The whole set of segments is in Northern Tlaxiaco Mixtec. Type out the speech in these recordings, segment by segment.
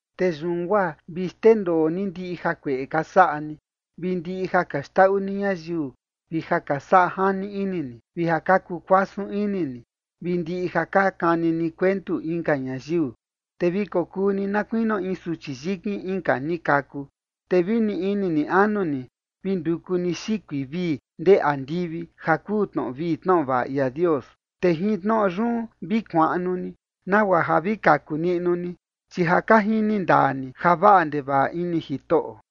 Te yun guaa vi xndendoo ni ndiꞌi jakueꞌe ka saꞌa ni, vi ndiꞌi ja ka xndaꞌu ni ñayiu, vi ja ka saꞌa jani ini ni, vi ja ka kuu kuasun ini ni, vi ndiꞌi ja ka kani ni kuentu inka ñayiu. Te vi kokuu ni na kuinio in suchi yikin inka ni kaku, te vi ni ini ni anu ni vi nduku ni xikui vii ndee andivi ja kuu tnoꞌo vii tnoꞌo vaꞌa ia Dios. Te jin tnoꞌo yun vi kuaꞌnu ni nagua ja vi kaku niꞌnu ni, chi ja ka jini ndaa ni ja vaꞌa ndevaꞌa ini Jitoꞌo.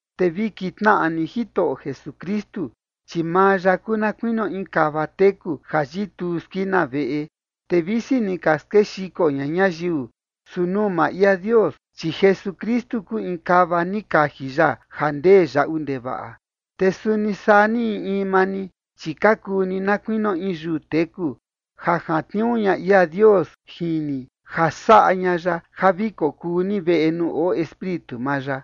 Te vi kintnaꞌa ni Jitoꞌo Jesukristu, chi maa ya kuu na kuinio in kava teku ja yituu skina veꞌe, te visi ni ka skexiko ña ñayiu, su nuu maa ia Dios, chi Jesukristu kuu in kava ni kaji ya ja ndee yaꞌu ndevaꞌa. Te suni saa ni in in maa ni, chi ka kuu ni na kuinio in yuu teku, ja jantniuu ña ia Dios jin ni ja saꞌa ña ya ja vi kokuu ni veꞌe nuu oo Espíritu maa ya.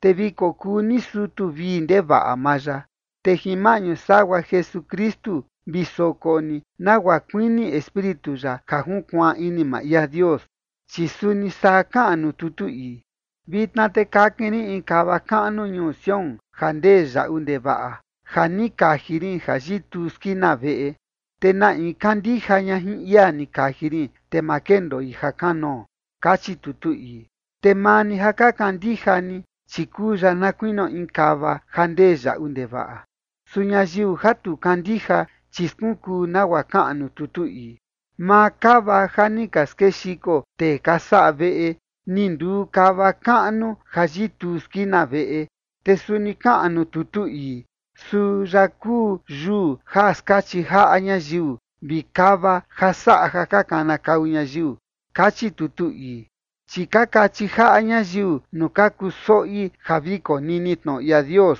Te vi kokuu ni sutu vii ndevaꞌa maa ya, te jin maꞌñu sagua Jesukristu vi soko ni nagua kuini Espíritu ya ja junkuaan ini maa ia Dios. Chi suni saa kaꞌan nuu tutu ii: Vitna te kakin rin in kava kaꞌnu ñuu Sión ja ndee yaꞌu ndevaꞌa, ja ni kaji rin ja yituu skina veꞌe, te na in kandija ña jin ia ni kaji rin, te ma kendoi ja kanoo. Kachi tutu ii. Te maa ni ja ka kandija ni, chi kuu ya na kuinio in kava ja ndee yaꞌu ndevaꞌa. Su ñayiu ja tu kandija, chi skunkuu nagua kaꞌan nuu tutu ii: Maa kava ja ni ka skexiko tee ka saꞌa veꞌe, ni nduu kava kaꞌnu ja yituu skina veꞌe. Te suni kaꞌan nuu tutu ii: Suu ya kuu yuu ja skachi jaꞌa ñayiu vi kava ja saꞌa ja ka kanakau ñayiu. Kachi tutu ii. Chi ka kachi jaꞌa ñayiu nuu ka kuu soꞌi ja vi konini tnoꞌo ia Dios,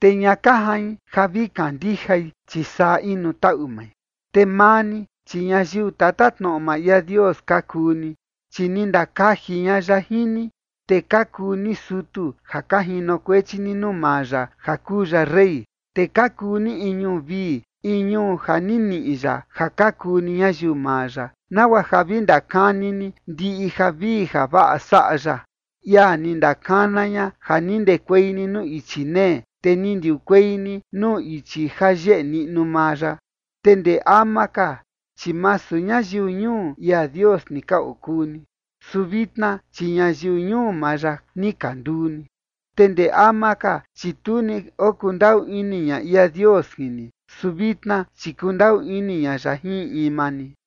te ña ka jain ja vi kandijai, chi saa inu taꞌu mai. Te maa ni, chi ñayiu tatatnoꞌo maa ia Dios ka kuu ni, chi ni ndakaji ña ya jin ni. Te ka kuu ni sutu ja ka jinokuechi ni nuu maa ya ja kuu ya rey. Te ka kuu ni in ñuu vii, in ñuu ja ni niꞌi ya ja ka kuu ni ñayiu maa ya, nagua ja vi ndakani ni ndiꞌi javii javaꞌa saꞌa ya, ia ni ndakana ña ja ni ndekuei ni nuu ichi nee, te ni ndiukuei ni nuu ichi ja yeꞌe niꞌnu maa ya. Te ndee ama ka, chi masu ñayiu ñuu ia Dios ni ka okuu ni, su vitna, chi ñayiu ñuu maa ya ni ka nduu ni. Te ndee ama ka, chi tu ni okundaꞌu ini ña ia Dios jin ni, su vitna, chi kundaꞌu ini ña ya jin in in maa ni.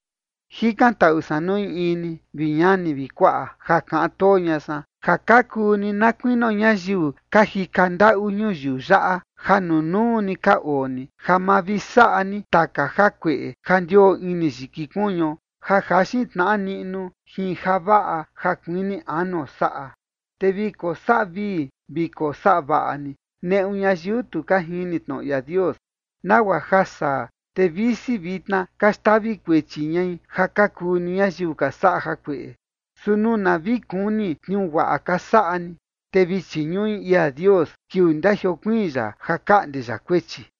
Jikantaꞌu san nuu in in ni, vi ñani vi kuaꞌa, ja kaꞌan too ña san, ja ka kuu ni na kuinio ñayiu ka jika ndaꞌu ñuyiu yaꞌa ja nunuu ni ka oo ni, ja ma vi saꞌa ni taka jakueꞌe ja ndioo ini yiki kuñuo ja jaxin tnaꞌa niꞌnu jin javaꞌa ja kuini anuo saꞌa. Te vi kosaꞌa vii vi kosaꞌa vaꞌa ni neꞌu ñayiu tu ka jini tnoꞌo ia Dios, nagua ja saa, te visi vitna ka xtavi kuechi ñai ja ka kuu ni ñayiu ka saꞌa jakueꞌe, su nuu na vi kuni tniuu guaꞌa ka saꞌa ni, te vi chiñuꞌi ia Dios kiuu ndajiokuiin ya ja kaꞌnde ya kuechi.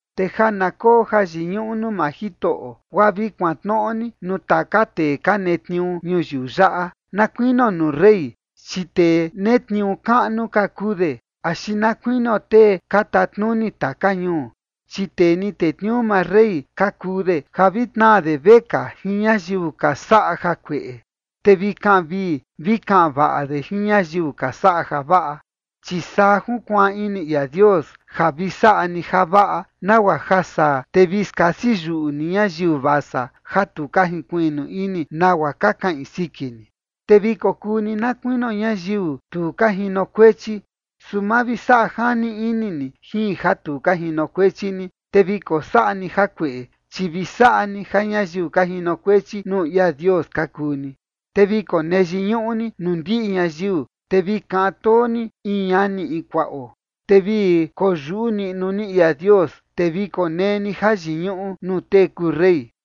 Te ja na koo jayiñuꞌu nuu maa Jitoꞌo, guaa vi kuantnoꞌo ni nuu taka tee ka netniuu ñuyiu yaꞌa, na kuinio nuu rey, chi tee netniuu kaꞌnu ka kuu de, axi na kuinio tee ka tatnuni taka ñuu, chi tee ni tetniuu maa rey ka kuu de, ja vi tnaa de vekaa jin ñayiu ka saꞌa jakueꞌe, te vi kaꞌan vii vi kaꞌan vaꞌa de jin ñayiu ka saꞌa javaꞌa. Chi saa junkuaan ini ia Dios, ja vi saꞌa ni javaꞌa, nagua ja saa, te vi skasi yuꞌu ni ñayiu vasa ja tu ka jinkuiꞌnu ini nagua ka kaꞌin siki ni. Te vi kokuu ni na kuinio ñayiu tu ka jinokuechi, su ma vi saꞌa jani ini ni jin ja tu ka jinokuechi ni, te vi kosaꞌa ni jakueꞌe, chi vi saꞌa ni ja ñayiu ka jinokuechi nuu ia Dios ka kuu ni. Te vi konee yiñuꞌu ni nuu ndiꞌi ñayiu, te vi kaꞌan too ni in ñanio in kuaꞌo. Te vi koyuꞌu niꞌnu ni ia Dios. Te vi konee ni jayiñuꞌu nuu tee kuu rey.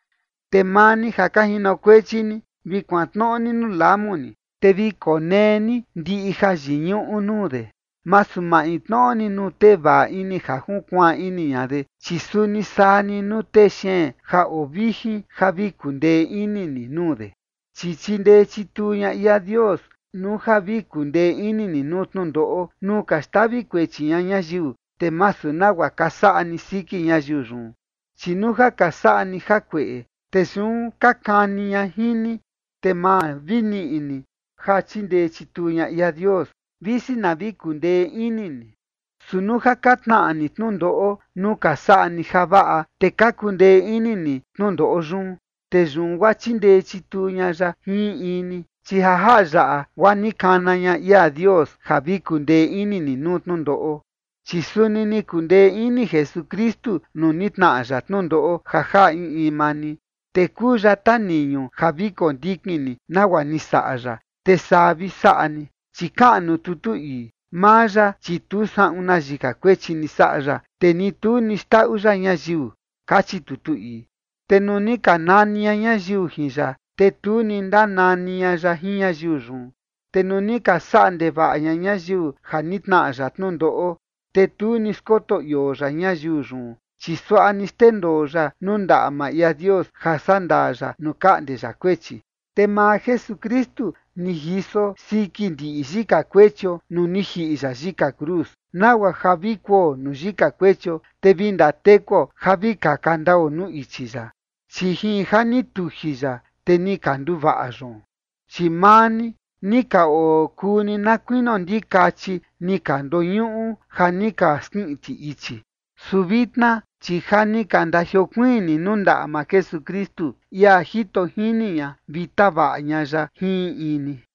Te maa ni ja ka jinokuechi ni, vi kuantnoꞌo ni nuu lamu ni, te vi konee ni ndiꞌi jayiñuꞌu nuu de, masu maintnoꞌo ni nuu tee vaꞌa ini ja junkuaan ini ña de, chi suni saa ni nuu tee xeen ja oo vijin ja vi kundee ini ni nuu de. Chi chindee chituu ña ia Dios nuu ja vi kundee ini ni nuu tnundoꞌo nuu ka xtavi kuechi ña ñayiu, te masu nagua ka saꞌa ni siki ñayiu yun. Chi nuu ja ka saꞌa ni jakueꞌe, te yun ka kani ña jin ni, te ma vi niꞌi ni ja chindee chituu ña ia Dios, visi na vi kundee ini ni. Su nuu ja ka tnaꞌa ni tnundoꞌo nuu ka saꞌa ni javaꞌa, te ka kundee ini ni tnundoꞌo yun, te yun guaa chindee chituu ña ya jin in in ni. Chi ja jaꞌa yaꞌa guaa ni kana ña ia Dios ja vi kundee ini ni nuu tnundoꞌo, chi suni ni kundee ini Jesukristu nuu ni tnaꞌa ya tnundoꞌo ja jaꞌa in in maa ni. Te kuu ya taniñu ja vi kondikin ni nagua ni saꞌa ya, te saa vi saꞌa ni. Chi kaꞌan nuu tutu ii: Maa ya, chi tu saꞌun na yika kuechi ni saꞌa ya, te ni tu ni xndaꞌu ya ñayiu, kachi tutu ii. Te nuu ni ka nani ña ñayiu jin ya, te tu ni ndanani ña ya jin ñayiu yun. Te nuu ni ka saꞌa ndevaꞌa ña ñayiu ja ni tnaꞌa ya tnundoꞌo, te tu ni skoto ioo ya ñayiu yun, chi suaꞌa ni xndendoo ya nuu ndaꞌa maa ia Dios ja saꞌa ndaa ya nuu kaꞌnde ya kuechi. Te maa Jesukristu ni jiso siki ndiꞌi yika kuechio nuu ni jiꞌi ya yika cruz, nagua ja vi kuo nuu yika kuechio, te vi ndatekuo ja vi kaka ndao nuu ichi ya. Chi jin ja ni tuji ya, te ni ka nduvaꞌa yoon. Chi maa ni ni ka okuu ni na kuinio ndikachi ni ka ndoñuꞌu ja ni ka skiꞌin ti ichi. Su vitna, chi ja ni ka ndajiokuiin ni nuu ndaꞌa maa Jesukristu, ia jito jini ña vi tavaꞌa ña ya jin in in ni.